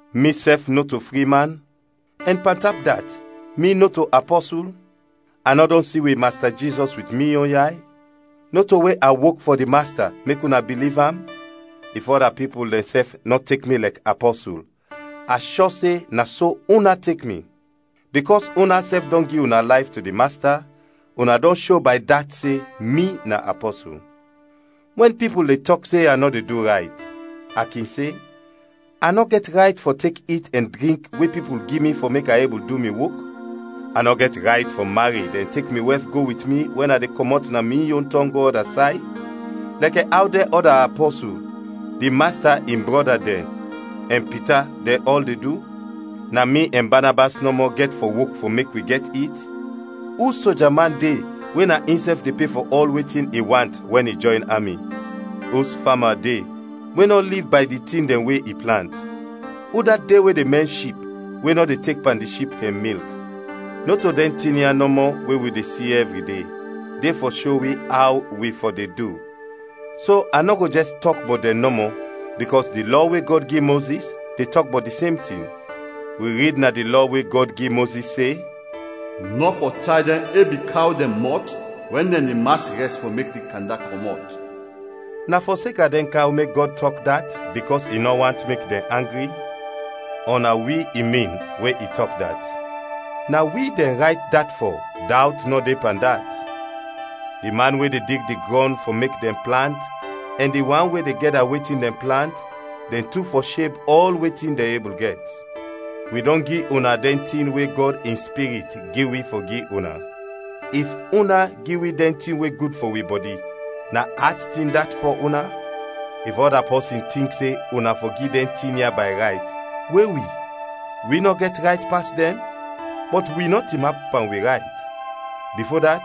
Misɛf nɔto fri man? Ɛn pantap dat, mi nɔto apɔsul? A nɔ dɔn si wi Masta Jizɔs wit mi yon yay? Nɔto we a wok fɔ di Masta mek una biliv am? If ɔda pipul dɛnsɛf nɔ tek mi lɛk apɔsul, a shɔ se na so una tek mi! Bikɔs unasɛf dɔn gi una layf to di Masta, una dɔn sho bay dat se mi na apɔsul. Wɛn pipul de tɔk se a nɔ de du rayt, a kin se: A nɔ gɛt rayt fɔ tek it ɛn drink we pipul gi mi fɔ mek a ebul du mi wok? A nɔ gɛt rayt fɔ mared ɛn tek mi wɛf go wit mi wɛn a de kɔmɔt na mi yon tɔng go ɔda say, lɛkɛ aw dɛn ɔda apɔsul, di Masta in brɔda dɛn, ɛn Pita dɛn ɔl de du? Na mi ɛn Banabas nɔmɔ gɛt fɔ wok fɔ mek wi gɛt it? Us soja man de we na insɛf de pe fɔ ɔl wetin i want wɛn i jɔyn ami? Us fama de we nɔ liv bay di tin dɛn we i plant? Udat de we de mɛn ship we nɔ de tek pan di ship dɛn milk? Nɔto dɛn tin ya nɔmɔ we wi de si ɛvri de, de fɔ sho wi aw wi fɔ de du, so a nɔ go jɛs tɔk bɔt dɛn nɔmɔ, bikɔs di Lɔ we Gɔd gi Mozis de tɔk bɔt di sem tin. Wi rid na di Lɔ we Gɔd gi Mozis se, “Nɔ fɔ tay dɛn ebi kaw dɛn mɔt wɛn dɛn de mas rɛs fɔ mek di kanda kɔmɔt.” Na fɔseka dɛn kaw mek Gɔd tɔk dat bikɔs i nɔ want mek dɛn angri? Ɔ na wi i min we i tɔk dat? Na wi dɛn rayt dat fɔ, dawt nɔ de pan dat. Di man we de dig di grɔn fɔ mek dɛn plant ɛn di wan we de gɛda wetin dɛn plant, dɛn tu fɔ sheb ɔl wetin dɛn ebul gɛt. Wi dɔn gi una dɛn tin we Gɔd in Spirit gi wi fɔ gi una. If una gi wi dɛn tin we gud fɔ wi bɔdi, na at tin dat fɔ una? If ɔda pipul tink se una fɔ gi dɛn tin ya bay rayt, we wi? Wi nɔ gɛt rayt pas dɛn? Bɔt wi nɔ tinap pan wi rayt. Bifo dat,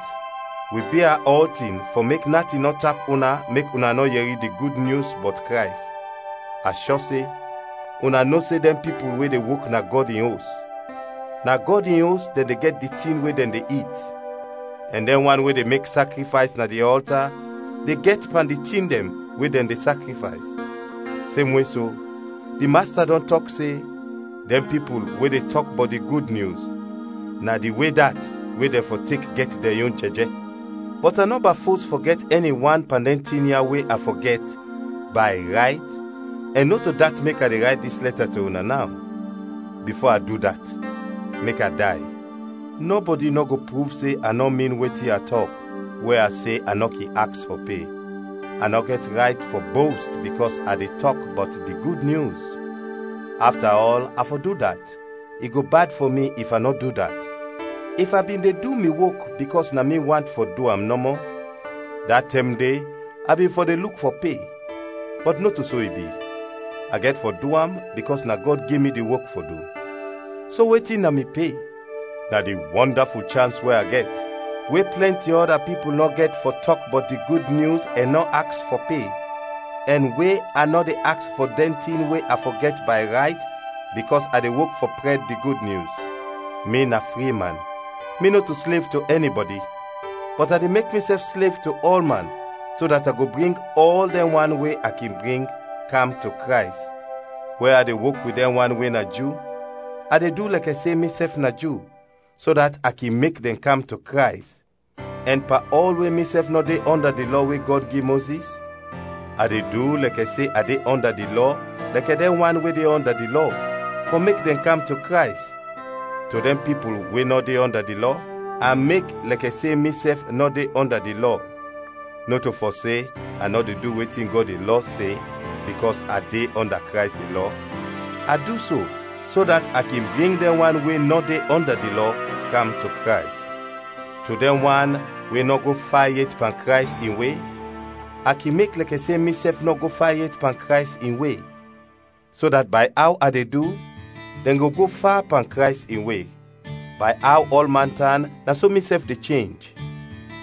wi bia ɔltin fɔ mek natin nɔ tap una mek una nɔ yɛri di Gud Nyus bɔt Krays. A shɔ se una no se dɛn pipul we de wok na Gɔd in Os, na Gɔd in Os dɛn de gɛt di tin we dɛn de it, ɛn dɛn wan we de mek sakrifays na di ɔlta de gɛt pan di tin dɛn we dɛn de sakrifays. Semwe so, di Masta dɔn tɔk se, dɛn pipul we de tɔk bɔt di Gud Nyus, na di we dat we dɛn fɔ tek gɛt dɛn yon jɛjɛ. Bɔt a nɔba fos fɔ gɛt ɛni wan pan dɛn tin ya we a fɔ gɛt, bay rayt, ɛn nɔto dat mek a de rayt dis lɛta to una naw. Bifo a du dat mek a day. Nɔbɔdi nɔ go pruv se a nɔ min wetin a tɔk we a se a nɔ kin aks fɔ pe. A nɔ gɛt rayt fɔ bost bikɔs a de tɔk bɔt di Gud Nyus. Afta ɔl a fɔ du dat, i go bad fɔ mi if a nɔ du dat! If a bin de du mi wok bikɔs na mi want fɔ du am nɔmɔ, da tɛm de a bin fɔ de luk fɔ pe; bɔt nɔto so i bi, a gɛt fɔ du am bikɔs na Gɔd gi mi di wok fɔ du. So wetin na mi pe? Na di wɔndaful chans we a gɛt, we plɛnti ɔda pipul nɔ gɛt fɔ tɔk bɔt di Gud Nyus ɛn nɔ aks fɔ pe, ɛn we a nɔ de aks fɔ dɛn tin we a fɔ gɛt bay rayt bikɔs a de wok fɔ prɛd di Gud Nyus. Mi na fri man, mi nɔto slev to ɛnibɔdi; bɔt a de mek misɛf slev to ɔlman, so dat a go bring ɔl dɛn wan we a kin bring, kam to Krays. Wɛn a de wok wit dɛn wan we na Ju, a de du lɛkɛ se misɛf na Ju, so dat a kin mek dɛn kam to Krays, ɛn pan ɔl we misɛf nɔ de ɔnda di Lɔ we Gɔd gi Mozis, a de du lɛkɛ se a de ɔnda di Lɔ lɛkɛ dɛn wan we de ɔnda di Lɔ, fɔ mek dɛn kam to Krays. To dɛn pipul we nɔ de ɔnda di Lɔ, a mek lɛkɛ se misɛf nɔ de ɔnda di Lɔ (nɔto fɔ se a nɔ de du wetin Gɔd in lɔ se, bikɔs a de ɔnda Krays in lɔ), a du so, so dat a kin bring dɛn wan we nɔ de ɔnda di Lɔ kam to Krays. To dɛn wan we nɔ go fa yet pan Krays in we, a kin mek lɛkɛ se misɛf no go fa yet pan Krays in we, so dat bay aw a de du, dɛn go go fa pan Krays in we: bay aw ɔlman tan na so misɛf de chenj,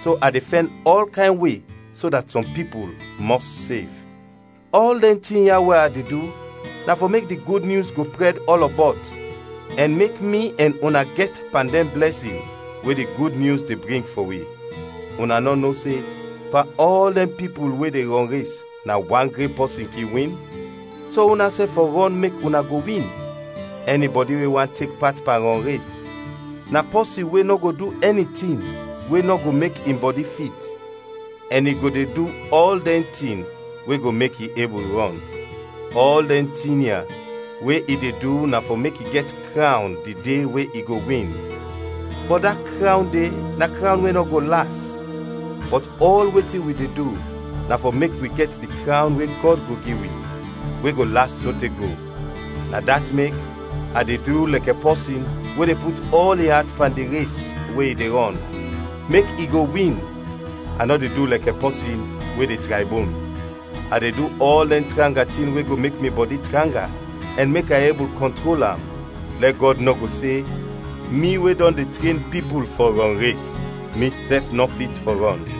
so a de fɛn ɔl kayn we so dat sɔm pipul mɔs sev. Ɔl dɛn tin ya we a de du na fɔ mek di Gud Nyus go prɛd ɔlɔbɔt, ɛn mek mi ɛn una gɛt pan dɛn blɛsin we di Gud Nyus de bring fɔ wi. Una nɔ no se pan ɔl dɛn pipul we de rɔnres na wan gren pɔsin kin win? So unasɛf fɔ rɔn mek una go win. Ɛnibɔdi we want tek pat pan rɔnres, na pɔsin we nɔ go du ɛni tin we nɔ go mek in bɔdi fit, ɛn i go de du ɔl dɛn tin we go mek i ebul rɔn. Ɔl dɛn tin ya we i de du na fɔ mek i gɛt krawn di de we i go win, bɔt da krawn de na krawn we nɔ go las; bɔt ɔl wetin wi de du, na fɔ mek wi gɛt di krawn we Gɔd go gi wi, we go las sote go. Na dat mek, a de du lɛkɛ pɔsin we de put ɔl in at pan di res we i de rɔn, mek i go win, a nɔ de du lɛkɛ pɔsin we de traybon. A de du ɔl dɛn tranga tin we go mek mi bɔdi tranga ɛn mek a ebul kɔntrol am, lɛ Gɔd nɔ go se, mi we dɔn tren pipul fɔ rɔnres, misɛf nɔ fit fɔ rɔn.